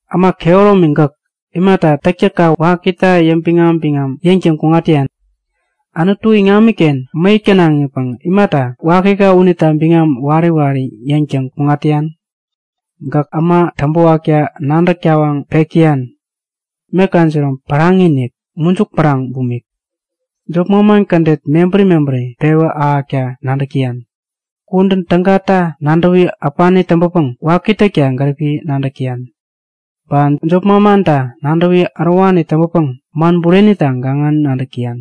Äma kehäromi gäk, imata täktäkka wakita yäŋbiŋam-biŋam yäŋtäŋ kuŋat täyan? Anutu iŋamiken mäyäk tänaŋipäŋ imata wakika unita biŋam wari wari yäŋtäŋ kuŋat täyan? Gäk äma täŋpäwakta nadäk tawaŋ pek täyan. Meka jinom päraŋi-inik, mujuk päraŋ bumik. Jop manman kädet mebäri mebäri pewä ahäkta nadäk täyan. Kudän tägata nadäwi äpani täŋpäpäŋ waki täkta gäripi nadäk täyan. Ba jop manmanta nadäwi ärowani täŋpäpäŋ man burenita gaŋani nadäk täyan.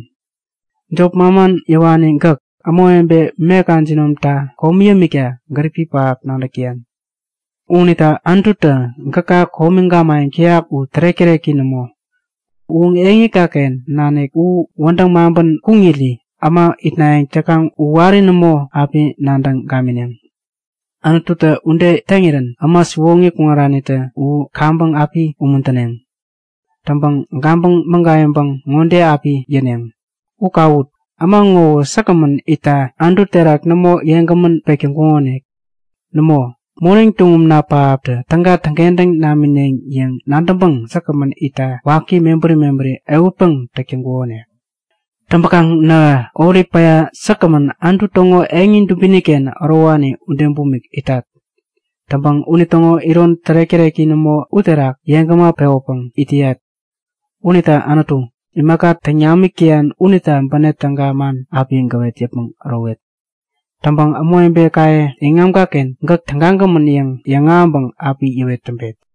Jop manman yäwani gäk, ämawebe meka jinomtä komi yämikta gäripi pähap nadäk täyan. Unita Anututä gäka komi gamayäŋ täyak u tärek-täreki nämo. U eŋikaken nanik u wädäŋ maŋpän kuŋiri äma itnayäŋ täkaŋ u wari nämo api nadäŋ gamineŋ. Anututä ude täŋirän äma siwoŋi kuŋaranitä u kaŋpäŋ api umuntäneŋ. Täŋpäŋ gabäŋ mägayäŋpäŋ ŋode api yäneŋ; U kawut! Äma ŋowä säkgämän itta Anutu terak nämo yeŋgämän pek täŋkukonik. Nämo, moneŋ tuŋumna pähaptä täga täŋkentäŋ namineŋ yäŋ nadäŋpäŋ säkgämän itta waki mebäri mebäri ehutpäŋ täk täŋkukonik. Täŋpäkaŋ nähä olip päya säkgämän Anutu täŋo eŋi dubiniken ärowani ude bumik itat. Täŋpäŋ unitäŋo iron tärek-täreki nämo uterak yeŋgäma pewäpäŋ it täyat. Unita Anutu, imaka täŋ namik täyan unita bänep täga man api gäwet yäpmäŋ ärowet. Täŋpäŋ ämawebekaye iŋamiken gäk tägagämän yäŋ yäŋahäŋpäŋ api yäwet täŋpet.